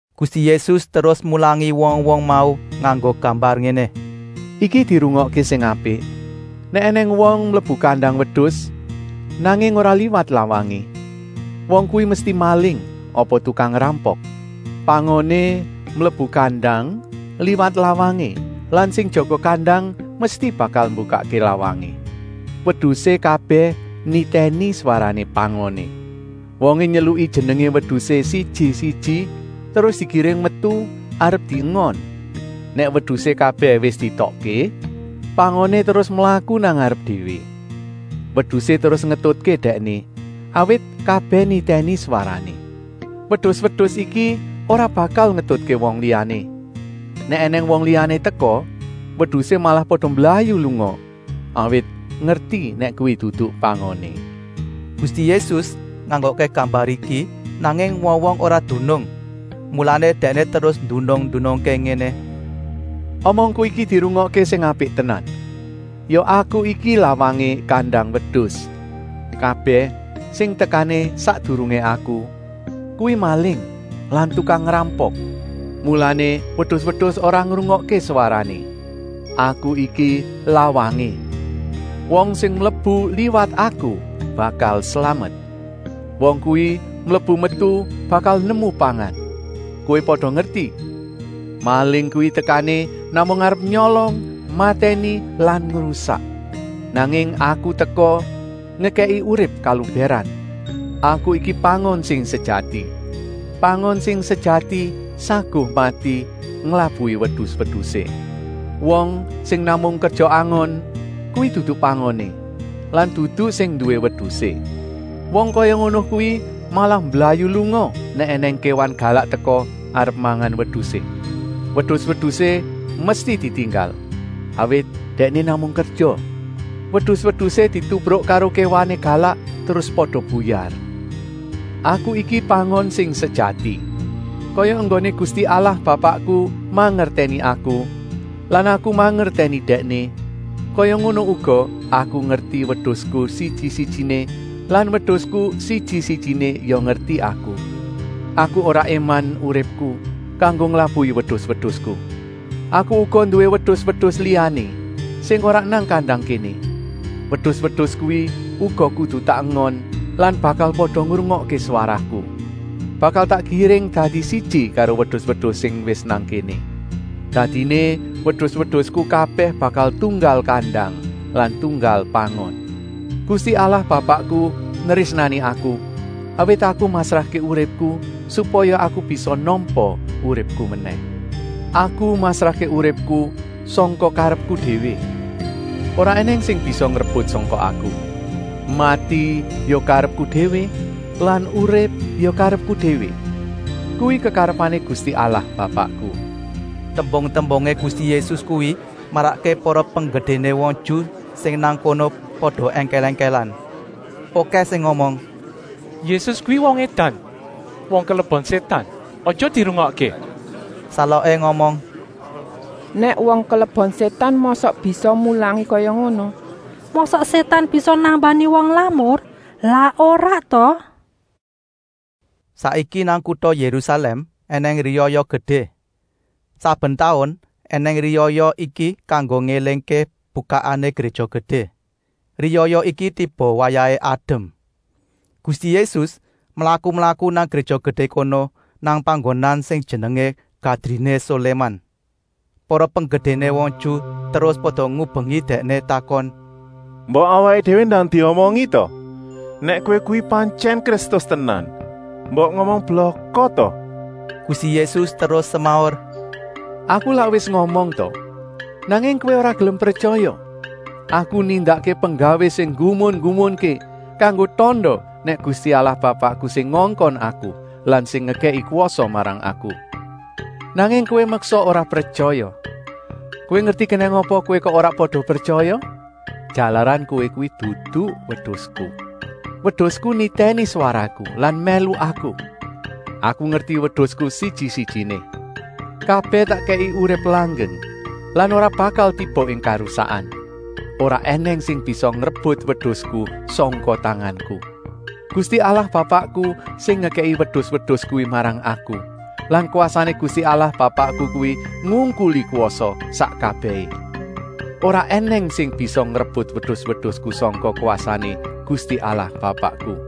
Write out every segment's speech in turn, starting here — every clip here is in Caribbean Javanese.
Gusti Yésus terus mulangi wong-wong mau nganggo gambar ngéné: “Iki dirungokké sing apik. Nèk ènèng wong mlebu kandang wedus, nanging ora liwat lawangé, wong kuwi mesti maling apa tukang ngrampok. Pangoné mlebu kandang liwat lawangé lan sing jaga kandang mesti bakal mbukakké lawangé. Wedusé kabèh nitèni swarané pangoné. Wongé nyeluki jenengé wedusé siji-siji terus digiring metu arep diengon. Nèk wedusé kabèh wis dietokké, pangoné terus mlaku nang ngarep déwé. Wedusé terus ngetutké dèkné, awit kabèh nitèni swarané. Wedus-wedus iki ora bakal ngetutké wong liyané. Nèk ènèng wong liyané teka, wedusé malah pada mblayu lunga, awit ngerti nèk kuwi dudu pangoné.” Gusti Yésus nganggokké gambar iki, nanging wong-wong ora dunung. Mulané Dèkné terus ndunung-ndunungké ngéné: “Omongku iki dirungokké sing apik tenan! Ya Aku iki lawangé kandang wedus. Kabèh sing tekané sakdurungé Aku, kuwi maling lan tukang ngrampok. Mulané wedus-wedus ora ngrungokké swarané. Aku iki lawangé. Wong sing mlebu liwat Aku bakal slamet. Wong kuwi mlebu-metu bakal nemu pangan. Kowé pada ngerti, maling kuwi tekané namung arep nyolong, matèni lan ngrusak. Nanging Aku teka ngekèki urip kalubèran. “Aku iki pangon sing sejati. Pangon sing sejati saguh mati nglabuhi wedus-wedusé. Wong sing namung kerja angon kuwi dudu pangoné lan dudu sing nduwé wedusé. Wong kaya ngono kuwi malah mblayu lunga nèk ènèng kéwan galak teka arep mangan wedusé. Wedus-wedusé mesti ditinggal, awit dèkné namung kerja. Wedus-wedusé ditubruk karo kéwané galak terus pada buyar. Aku iki pangon sing sejati. Kaya enggoné Gusti Allah Bapakku mangertèni Aku lan Aku mangertèni Dèkné, kaya ngono uga Aku ngerti wedusku siji-sijiné lan wedusku siji-sijiné ya ngerti Aku. Aku ora éman uripku kanggo nglabuhi wedus-wedusku. Aku uga nduwé wedus-wedus liyané sing ora nang kandang kéné. Wedus-wedus kuwi uga kudu tak engon lan bakal pada ngrungokké swaraku. Bakal tak giring dadi siji karo wedus-wedus sing wis nang kéné. Dadiné wedus-wedusku kabèh bakal tunggal kandang lan tunggal pangon. “Gusti Allah Bapakku nrésnani Aku, awit Aku masrahké uripku, supaya Aku bisa nampa uripku menèh. Aku masrahké uripku sangka karepku déwé. Ora ènèng sing bisa ngrebut sangka Aku. Mati ya karepku déwé lan urip ya karepku déwé. Kuwi kekarepané Gusti Allah Bapakku.” Tembung-tembungé Gusti Yésus kuwi marakké para penggedéné wong Ju sing nang kono pada èngkèl-èngkèlan. Okèh sing ngomong: “Yésus kuwi wong édan, wong kelebon sétan. Aja dirungokké.” Saloké ngomong: “Nèk wong kelebon sétan mosok bisa mulangi kaya ngono. Mosok sétan bisa nambani wong lamur? Lak ora ta?” Saiki nang kuta Yérusalèm ènèng riyaya gedé. Saben taun ènèng riyaya iki kanggo ngélingké bukakané Gréja Gedé. Riyaya iki tiba wayahé adem. Gusti Yésus mlaku-mlaku nang Gréja Gedé kono nang panggonan sing jenengé Gadriné Soléman. Para penggedéné wong Ju terus pada ngubengi Dèkné takon: “Mbok awaké déwé ndang diomongi ta! Nèk kowé kuwi pantyèn Kristus tenan, mbok ngomong blaka ta?” Gusti Yésus terus semaur: “Aku lak wis ngomong ta! Nanging kowé ora gelem pretyaya. Aku nindakké penggawé sing nggumun-nggumunké kanggo tanda nèk Gusti Allah Bapakku sing ngongkon Aku lan sing ngekèki kwasa Aku. Nanging kowé meksa ora pretyaya. Kowé ngerti kenèng apa kowé kok ora pada pretyaya? Jalaran kowé kuwi dudu wedusku. Wedusku nitèni swaraku lan mèlu Aku. Aku ngerti wedusku siji-sijiné. Kabèh tak kèki urip langgeng lan ora bakal tiba ing karusakan. Ora ènèng sing bisa ngrebut wedusku sangka tanganku. Gusti Allah Bapakku sing ngekèki wedus-wedus kuwi marang Aku lan kwasané Gusti Allah Bapakku kuwi ngungkuli kwasa sak kabèhé. Ora ènèng sing bisa ngrebut wedus-wedusku sangka kwasané Gusti Allah Bapakku.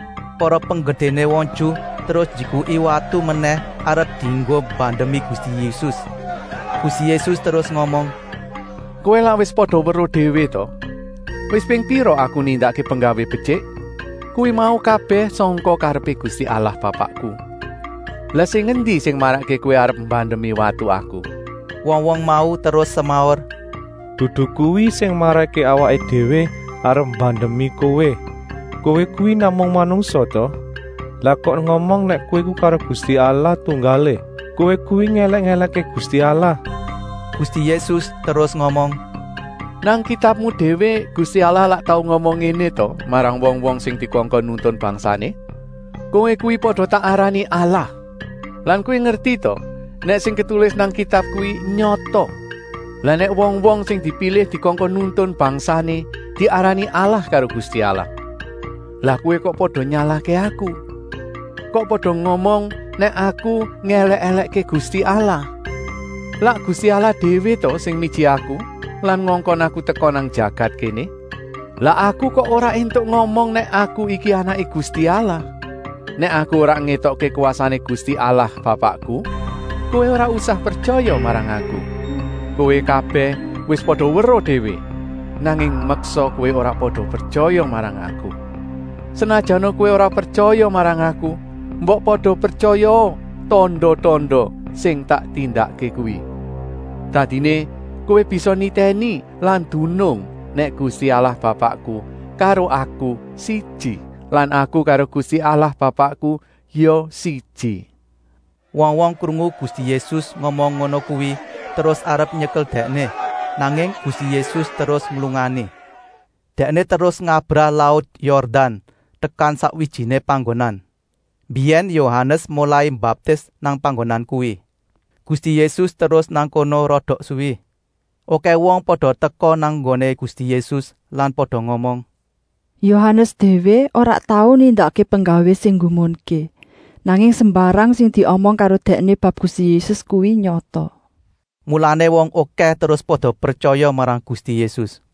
Para penggedéné wong Ju terus njikuki watu menèh arep dienggo mbandemi Gusti Yésus. Gusti Yésus terus ngomong: “Kowé lak wis pada weruh déwé ta? Wis ping pira Aku nindakké penggawé betyik? Kuwi mau kabèh sangka karepé Gusti Allah Bapakku. Lah sing endi sing marakké kowé arep mbandemi watu Aku?” Wong-wong mau terus semaur: “Dudu kuwi sing marakké awaké déwé arep mbandemi kowé! Kowé kuwi namung manungsa ta? Lah kok ngomong nèk Kowé karo Gusti Allah tunggalé. Kowé kuwi ngèlèk-èlèkké Gusti Allah!” Gusti Yésus terus ngomong: “Nang kitabmu déwé Gusti Allah lak tau ngomong ngéné ta marang wong-wong sing dikongkon nuntun bangsané: ‘Kowé kuwi pada tak arani allah!’ Lan kowé ngerti ta nèk sing ketulis nang Kitab kuwi nyata. Lah nèk wong-wong sing dipilih dikongkon nuntun bangsané diarani allah karo Gusti Allah, lah kowé kok pada nyalahké Aku. Kok pada ngomong nèk Aku ngèlèk-èlèkké Gusti Allah? Lak Gusti Allah déwé ta sing miji Aku lan ngongkon Aku teka nang jagat kéné? Lah Aku kok ora éntuk ngomong nèk Aku iki Anaké Gusti Allah? Nèk Aku ora ngétokké kwasané Gusti Allah Bapakku, kowé ora usah pretyaya marang Aku. Kowé kabèh wis pada weruh déwé, nanging meksa kowé ora pada pretyaya marang Aku. Senajana kowé ora pretyaya marang Aku, mbok pada pretyayaa tanda-tanda sing tak tindakké kuwi. Dadiné kowé bisa nitèni lan dunung nèk Gusti Allah Bapakku karo Aku siji lan Aku karo Gusti Allah Bapakku ya siji.” Wong-wong krungu Gusti Yésus ngomong ngono kuwi terus arep nyekel Dèkné, nanging Gusti Yésus terus nglungani. Dèkné terus ngabrah laut Yordan tekan sakwijiné panggonan. Mbiyèn Yohanes molai mbaptis nang panggonan kuwi. Gusti Yésus terus nang kono rada suwi. Okèh wong pada teka nang nggoné Gusti Yésus lan pada ngomong: “Yohanes déwé ora tau nindakké penggawé sing nggumunké, nanging sembarang sing diomong karo dèkné bab Gusti Yésus kuwi nyata.” Mulané wong okèh terus pada pretyaya marang Gusti Yésus.